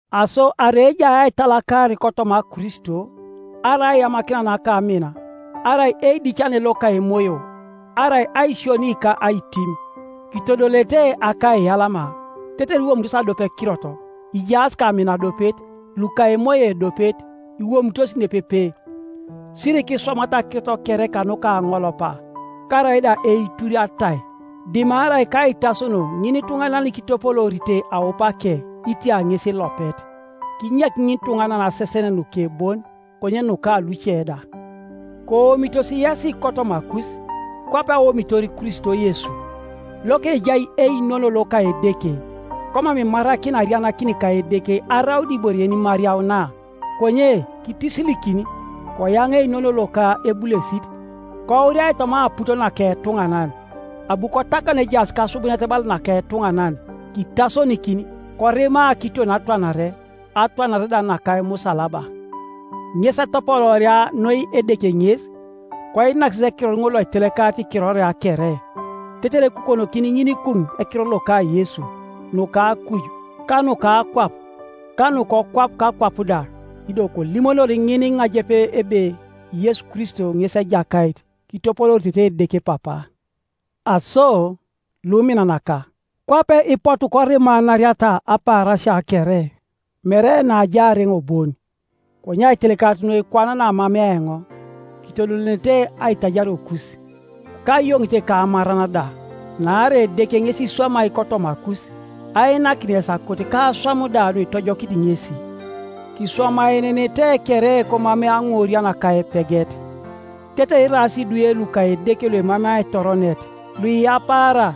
Aso arai ejai aitalakar kotoma Kristo, arai aiyamakina naka amin, arai eidicane loka Emoyo, arai aisioni ka aitim, kitodolete akaiyalama, tetere iwomitos adiopekirot, ijaas kamin adiopet, luka emoyo ediopet, iwomitos nepepe. Sirikiswamata akirot kere kanuka aŋolopa, karaida eitur atai, dimarai kaitasono ŋinituŋanan kitopoloorite aupake, itia ŋes ilopet. Kinyek ŋinituŋanan asesen nuke bon, konye nuka luce da. Koomitos yesi kotomakus, kwape aomitor Kristo Yesu, lokejai einono loka Edeke, komam imarakina arianakin ka Edeke araun ibore yenimariauna, konye kitisilikin, koyaŋaa einono loka ebulesit, kouriai toma aput naka etuŋanan. Abu kotakan ejaas kasubunet bala naka etuŋanan, kitasonikin, korima kiton atwanare, atwanare da naka emusalaba. Ŋes etopolooria noi Edeke ŋes, koinak ŋes ekiror ŋol loitelekarit ikiroria kere, tetere ekukonokini ŋinikuŋ ekiror loka Yesu, nuka akuj, ka nuka akwap, ka nukokwap kakwap da; ido kolimonori ŋiniŋajep ebe Yesu Kristo ŋes Ejakait, kitopolooritete Edeke Papa. Aso, luminanaka, kwape ipotu korimanariata apaarasia kere, mere naajaar eoŋ bon, konye aitelekarit noi kwana naamamea eoŋ, kitodolenenete aitajariokus, kayoŋite ka amaran da, naarai Edeke ŋes iswamai kotomakus, ainakin yes akot ka aswam da nuitojokit ŋesi. Kiswamaenenete kere komamei aŋurian ka epeget, tetere iraas idwe luka Edeke luemamei aitoronet, luiyapaara,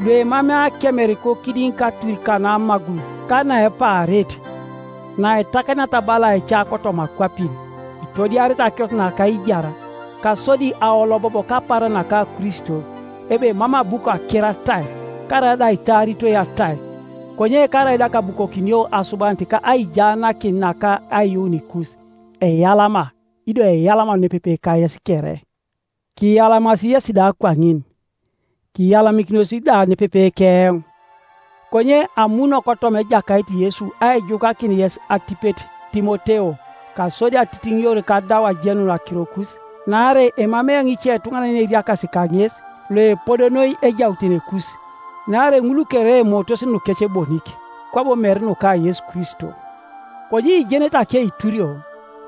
luemamei akemer kokidiŋ katur kanamagul, ka naepaarit, naitakaniata bala aica kotoma akwapin, itodiarete akirot naka aijar, kasodi aolobob kapaaran naka Kristo, ebe mam abu kaker atai, karaida aitaaritoi atai. Konye karaida kaabukokinio asubanit ka aijaanakin naka aiyuunikus, eyalama, ido eyalama nepepe kayes kere. Kiyalamas yesi da kwaŋin, kiyalamikinos da nepepe keoŋ. Konye amuno kotoma Ejakait Yesu aijukakin yes atipet Timoteo, kasodi atitiŋior kadau ajenun akirokus. Naarai emamei eoŋ icetuŋanan yeneriakasi kaŋes, loepodo noi ejautenekus. Naarai ŋul kere emootos nukec bonik, kwabo mere nuka Yesu Kristo. Konye ijenete akeiturio,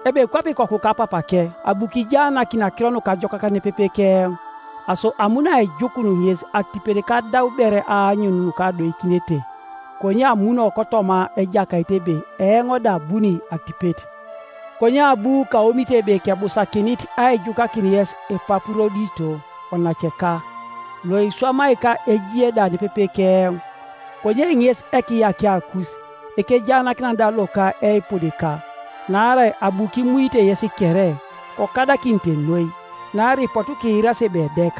ebe kwape ikoku kapapake abu kijaanakini Akiro Nukajokak nepepe keoŋ, Aso amuno aijukun ŋes atipet kadau ber aanyun nukadoikinete; konye amuno kotoma Ejakait ebe eoŋ da abuni atipet. Konye abu kaomit ebe kebusakinit aijukakin yes Epapurodito onaceka, loiswamai ka ejie da nepepe keoŋ, konye ŋes ekiyakiakus, ekejaanakinan da loka eipudika. Naarai abu kimuite yes kere, kokadakinite noi, naarai ipotu kiirasi ebe edek.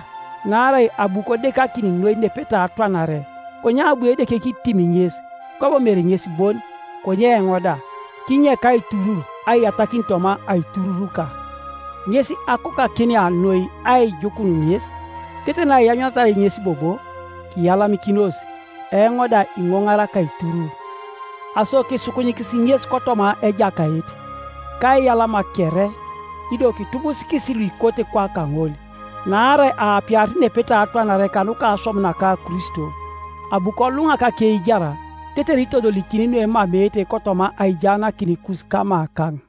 Naarai abu kodekakin noi nepetai atwanare, Konye abu Edeke kitim ŋes, kwabo mere ŋes bon, konye eoŋ da, kinyek aiturur aiyatakin toma aitururuka. Ŋes akokakinia noi aijukun ŋes, tetere naianyuniata ŋes bobo, kiyalamikinos, eoŋ da iŋoŋar akaiturur. Aso kisukunyikisi ŋes kotoma Ejakait, kaiyalama kere; ido kitubusikis luikote kwaka ŋol, naarai aapiarit nepetai atwanare kanuka aswam naka Kristo, abu koluŋak akeijar tetere itodolikini nuemameete kotoma aijaanakinikus kamakaŋ.